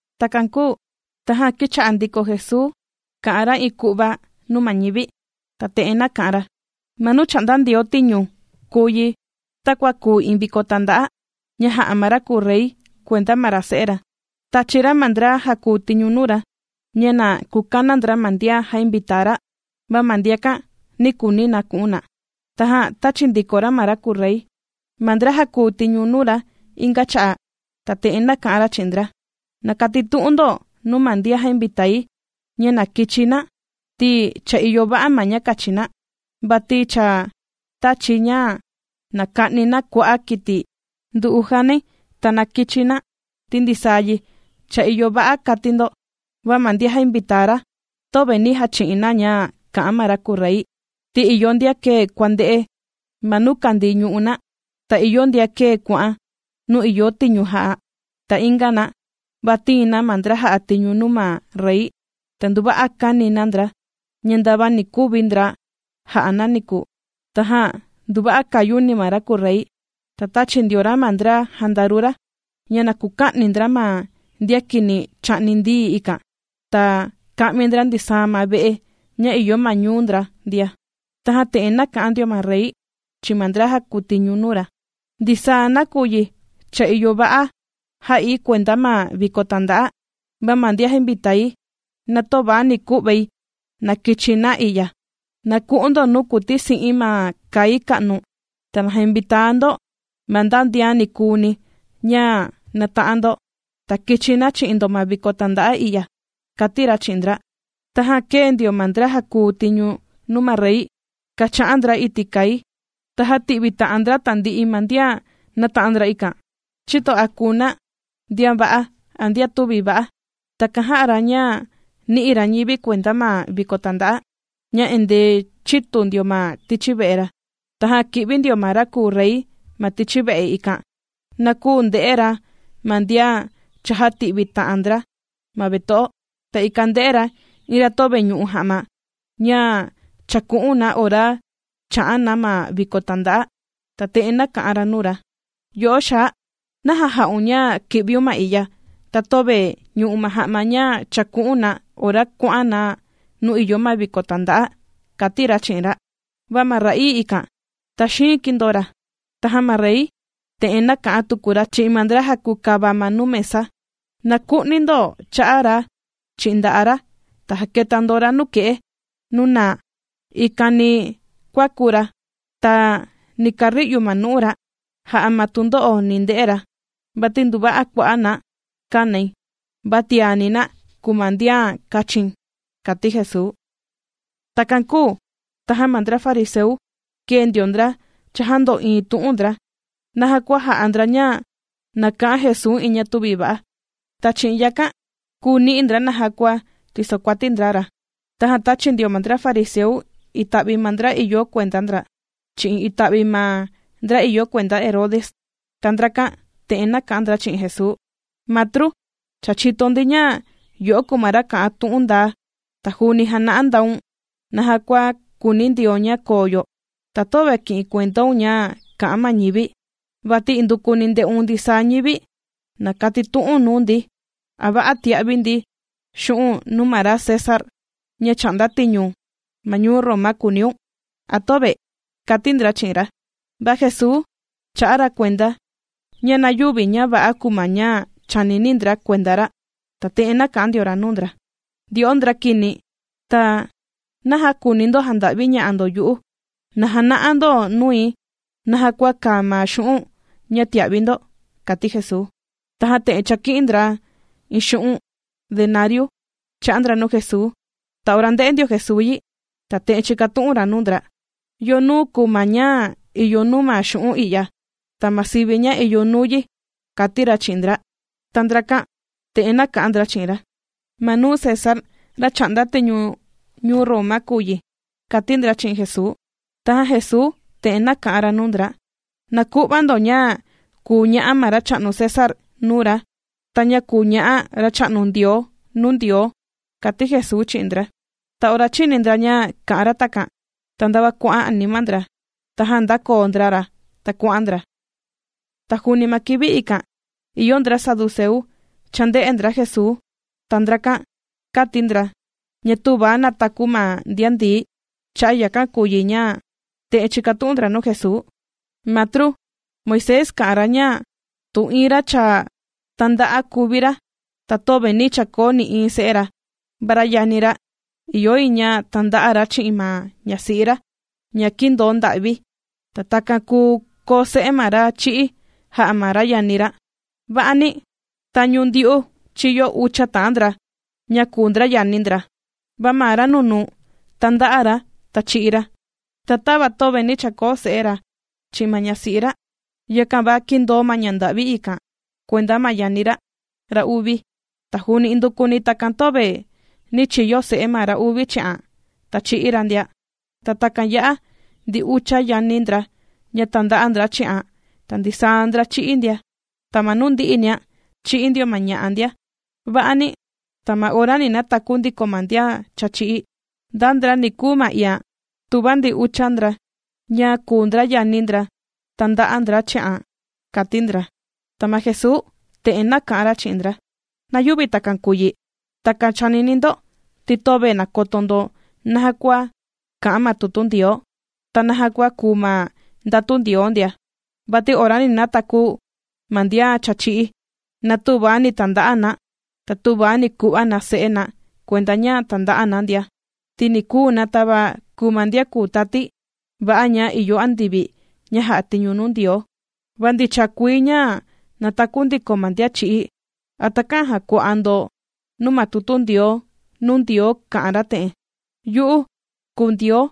Takan kūu tajan kīcha'a ndiko Jesuu kà'an ra iin ku'va nuu ma ñivi, ta te'en nāka'an ra: ―Ma nuu chà'nda Ndioo tiñu kùu yi, takua kùu iin viko tànda'a ña jā'a ma ra kùu rey kuenda ma ra se'e ra. Tāchi ra ma ndra jàkuu tiñu nuu ra, ña na kukana ndra ma ndian jainvitaa ra, va ma ndiakan nī kuuni na ku'un na. Tajan tāchi ndiko ma ra kùu rey ma ndra jàkuu tiñu nuu ra inga cha'a', ta te'en nāka'an ra chi'in ndra: “Na katitu'un ndo nuu ma ndian jainvitaa, ña na kichi na, ti cha ìyo va'a ma ña kachi na, vati cha tāchi̱ ña na ka'ni na kua'a' kiti ndu'u janai. Ta na kichi na, ti ndisaa yi cha ìyo va'a”, kati ndo. Va ma ndian jainvitaa ra töve nī jachi'in na ña kà'an ma ra kùu rey, ti ìyo ndian kēe kuànde'e ma nuu kàndii ñu'u' na, ta ìyo ndian kēe kuà'an nuu ìyo tiñu jà'a na. Ta inga na, va tīin na ma ndra jà'a tiñu nuu ma rey, ta nduva'a kāni na ndra, ña ndava ni kuvi ndra jà'a na niku. Tajan nduva'a kāyuni ma ra kùu rey, ta tāchi ndio ra ma ndra jandaru ra, ña na kuka'ni ndra ma ndian kini chà'ni ndií ikan, ta ka'mi ndra ndisaa ma ve'e ña ìyo ma ñuu ndra ndia. Tajan te'en nāka'an ndio ma rey chi'in ma ndra jàkuu tiñu nuu ra: “Ndisaa nakuyi cha ìyo va'a jā'i kuenda ma viko tanda'a, va ma ndian jainvitaai, na töva ni ku'vai na kichi na i'ya. Na ku'un ndo nuu kùtisi'in ma kai ka'nu, ta na jainvitaa ndo, ma nda ndian nikuuni ña nàta'an ndo, ta kichi na chi'in ndo ma viko tànda'a i'ya”, kàti ra chi'in ndra. Tajan kēe ndio ma ndra jàkuu tiñu nuu ma rey kàcha'an ndra iti' kai, ta jāti'vi ta'an ndra tandi'i ma ndian nāta'an ndra ikan, chïto a kùu na ndian va'a a ndian tüvi va'a. Takan jā'a ra ña nī'i ra ñivi kuenda ma viko tànda'a, ña endee chītu ndio ma tichi ve'e ra. ’Tajan kī'vi ndio ma ra kùu rey ma tichi ve'e, ikan na kuu nde'e ra ma ndian chājati'vi ta'an ndra ma veto'o, ta ikan ndē'e ra iin ra töve ñu'u ja'ma ña chàku'un na ora chà'an na ma viko tànda'a. Ta te'en nāka'an ra nuu ra: “Yo'o xaa, ¿naja jā'un ña kī'viun ma i'ya, ta töve ñù'u̱n ma ja'ma ña chàku'un na ora kuà'an na nuu ìyo ma viko tànda'a?”, kàti ra chi'in ra. Va ma ra'ii ikan taxiin kīndoo ra. Tajan ma rey, te'en nāka'an tuku ra chi'in ma ndra jàkukava ma nuu mesa: “Na ku'ni ndo cha'a ra chi'in nda'a' ra, ta jaketa ndo ra nuke'e nuu naa, ikan ni kuaku ra, ta ni kari'u ma nu'u ra, jà'a ma tundo'o ni nde'e ra.” Vati nduva'a kua'a' na kànai, va tiani na kùu ma ndian kàchi̱n ―kàti Jesuu. Takan kūu tajan ma ndra fariseu kēe ndio ndra chājando'iin tu'un ndra, naja kua jà'a ndra ña na ka'an Jesuu iin ña tüvi va'a, ta chi'in yakan kùu ni'i ndra naja kua tìsokuati ndra ra. Tajan tāchi ndio ma ndra fariseu ita'vi ma ndra ìyo kuenda ndra, chi'in ita'vi ma ndra ìyo kuenda Herode. Ta ndrakan te'en nāka'an ndra chi'in Jesuu: ―Matru, cha chìto ndi ña yo'o kùu ma ra kà'an tu'un ndaa, ta juuni jàna'a ndaun naja kua kùuni Ndioo ña koo yo, ta töve kì'in kuendaun ña kà'an ma ñivi, vati indukuni ndè'un ndisaa ñivi. Na katitu'u̱n nuu ndi: ¿A va'a tìa'vi ndi xu'un' nuu ma ra César, ña chà'nda tiñu ma ñuu Roma kùuniun?, ¿a töve? ―kàti ndra chi'in ra. Va Jesuu chā'a ra kuenda, ña na yüvi ña va'a kùu ma ña chànini ndra kuenda ra, ta te'en nāka'an ndio ra nuu ndra: ―Ndyo'o ndra kini, ta, ¿naja kùuni ndo janda'viña'a ndo yu'u? Na jana'a ndo nui naja kua kàa ma xu'un' ña tìa'vi ndo ―kàti Jesuu. Tajan chāki'in ndra iin xu'un' denariu chā'a ndra nuu Jesuu. Ta ora ndē'e ndio Jesuu yi, ta te'en chīkatu'un ra nuu ndra: ―¿Yo nuu kùu ma ña ìyo nuu ma xu'un' i'ya, ta ma sivi ña ìyo nuu yi? ―kàti ra chi'in ndra. Ta ndrakan te'en nāka'an ndra chi'in ra: ―Ma ña César, ra chà'nda tiñu ñuu Roma kùu yi ―kàti ndra chi'in Jesuu. Tajan Jesuu te'en nāka'an ra nuu ndra: ―Na ku'va ndo ña kùu ña'a ma racha'nu César nuu ra, ta ña kùu ña'a Racha'nu Ndioo nuu Ndioo ―kàti Jesuu chi'in ndra. Ta ora chīni ndra ña kā'an ra takan, ta ndava kuà'an anima ndra, tajan ndākoo ndra ra, ta kuà'an ndra. Ta juuni ma kivi ikan, ìyo ndra saduceu, chānde'e ndra Jesuu. Ta ndrakan kàti ndra, ña tüva nàtaku ma ndian ndií, cha'a' yakan kùu yi ña, te'en chīkatu'un ndra nuu Jesuu: ―Matru, Moisés kā'an ra ña, tu iin ra cha tānda'a kùvi ra, ta töve nī chakoo nï'iin se'e ra, ma ra yani ra, ìyo yi ña tanda'a ra chi'in ma ñasi'i ra ña kīndoo nda'vi, ta takan kùu koo se'e ma ra chī'í jà'a ma ra yani ra. Va'ani, tañu ndyu'u chīyo ucha ta'an ndra, ña kùu ndra yani ndra. Ma ra nunuu tānda'a ra, ta chī'í ra. Ta tava töve nī chakoo se'e ra chi'in ma ñasi'i ra, yakan va kīndoo ma ña nda'vi ikan kuenda ma yani ra, ra uvi. Ta juuni indukuni takan töve nī chiyo se'e ma ra uvi chi'an, ta chī'í ra ndia. Ta takan ya'a ndi ucha yani ndra ña tānda'a ndra chi'an ta ndisaa ndra chī'í ndia. Ta ma nuu ndi'inia, chī'í ndio ma ña'a ndia. Va'ani, ta ma ora ni nataku ndiko ma ndian cha chī'í, ¿nda ndra ni kuu ma iian, tuva ndi ucha ndra ña kùu ndra yani ndra tānda'a ndra chi'an? ―kàti ndra. Ta ma Jesuu te'en nāka'an ra chi'in ndra: ―Na yüvi takan kùu yi, takan chànini ndo, ti töve nàkoto ndo naja kua kà'an ma tutu Ndioo, ta naja kua kùu ma ndatu Ndioo ndia. Vati ora ni nataku ma ndian cha chī'í, na tüva ni tanda'a na, ta tüva ni ku'va na se'e na kuenda ña tànda'a na ndia, ti ni kùu na tava kùu ma ndian kùu tati va'a ña ìyo andivi ña jà'a tiñu nuu Ndioo. Va ndicha kuii ña nàtaku ndiko ma ndian chī'í, ¿a takä'an jàkua'a ndo nuu ma tutu Ndioo, nuu kà'an ra te'en?: “Yu'u kùu Ndioo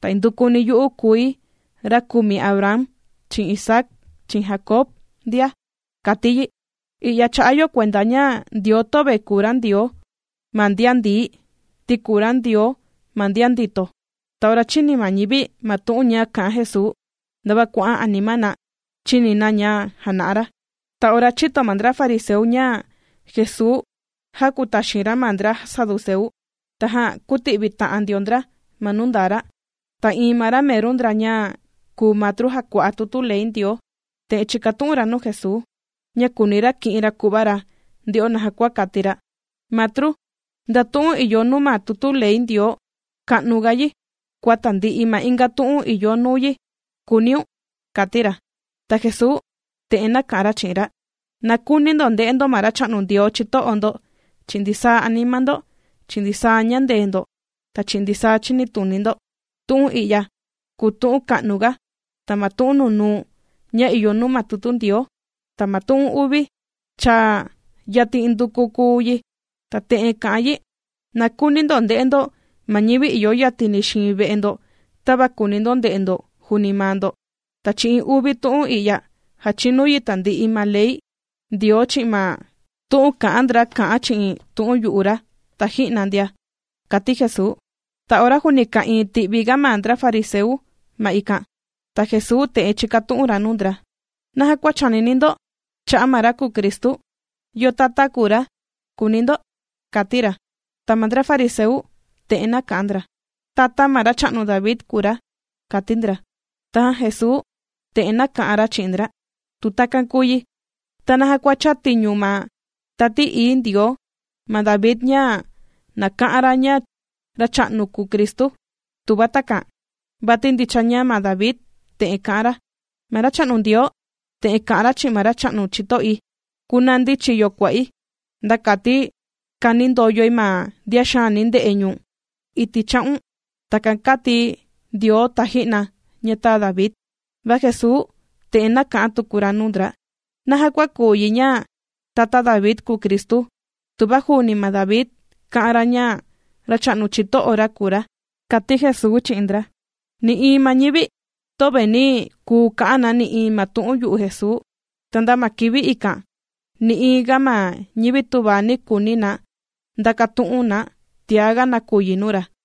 ta indukuni yu'u kùi ra kùmi Abraham chi'in Isaac chi'in Jacob ndia”, kàti yi. I'ya chà'a yo kuenda ña Ndioo töve kùu ra Ndioo ma ndian ndií, ti kùu ra Ndioo ma ndian ndito. Ta ora chīni ma ñivi ma tu'un ña kā'an Jesuu, ndava kuà'an anima na chìni na ña jàna'a ra. Ta ora chīto ma ndra fariseu ña Jesuu jākutaxin ra ma ndra saduceu, tajan kūti'vita'an ndio ndra ma nuu ndaa ra. Ta iin ma ra meru ndra ña kùu matru jàkua'a tutu ley Ndioo, te'en chīkatu'un ra nuu Jesuu, ña kùuni ra ki'in ra ku'va ra nde'o naja kua kati ra: ―Matru, ¿nda tu'un ìyo nuu ma tutu ley Ndioo ka'nu ga yi kua tandi'i ga ma inga tu'un ìyo nuu yi?, kùuniun ―kàti ra. Ta Jesuu te'en nāka'an ra chi'in ra: ―“Na kuuni ndo nde'e ndo ma Racha'nu Ndioo chito'o ndo chi'in ndisaa anima ndo, chi'in ndisaa ñandee ndo, ta chi'in ndisaa chinituni ndo.” Tu'un i'ya kùu tu'un ka'nuga, ta ma tu'un nunuu ña ìyo nuu ma tutu Ndioo. Ta ma tu'un uvi, cha yatin indukuni kùu yi, ta te'en kà'an yi: “Na kuuni ndo nde'e ndo ma ñivi ìyo yatini xiin ve'e ndo tava kùuni ndo nde'e ndo juuni maa ndo.” Ta chi'in uvi tu'un i'ya jàchinu yi tandi'i ma ley Ndioo chi'in ma tu'un kā'an ndra kà'an chi'in tu'un yu'u ra taji'na ndia ―kàti Jesuu. Ta ora juuni ka'ìin ti'vi ga ma ndra fariseu ma ikan, ta Jesuu te'en chīkatu'un ra nuu ndra: ―¿Naja kua chànini ndo cha'a' ma ra kùu Cristu? ¿Yo tata kùu ra?, kùuni ndo ―kàti ra. Ta ma ndra fariseu te'en nāka'an ndra: ―Tata ma racha'nu David kùu ra ―kàti ndra. Tajan Jesuu te'en nāka'an ra chi'in ndra: ―Tu takan kùu yi, ¿ta naja chātiñu ma Tati Ií Ndioo ma David ña na ka'an ra ña Racha'nu ra kùu Cristu, tuva takan? Vati ndicha ña ma David, te'en kā'an ra: Ma Racha'nu Ndioo, te'en kā'an ra chi'in ma Racha'nu chito'i: “Kunandi chiyo kua'i, nda kati kanindoyoi ma ndian xaani ndè'e ñu̱n iti' cha'un.” Takan kāti Ndioo taji'na ña tāa David. Va Jesuu te'en nāka'an tuku ra nuu ndra: ―¿Naja kua kùu yi ña, tata David kùu Cristu, tuva juuni ma David kā'an ra ña, Racha'nu chito'o ra kùu ra? ―kàti Jesuu chi'in ndra. Nï'iin ma ñivi töve nī kuu ka'an na nï'iin ma tu'un yu'u Jesuu. Ta nda ma kivi ikan nï'iin ga ma ñivi tüva ni kuuni na ndakatu'un na tiaga nakuyi nuu ra.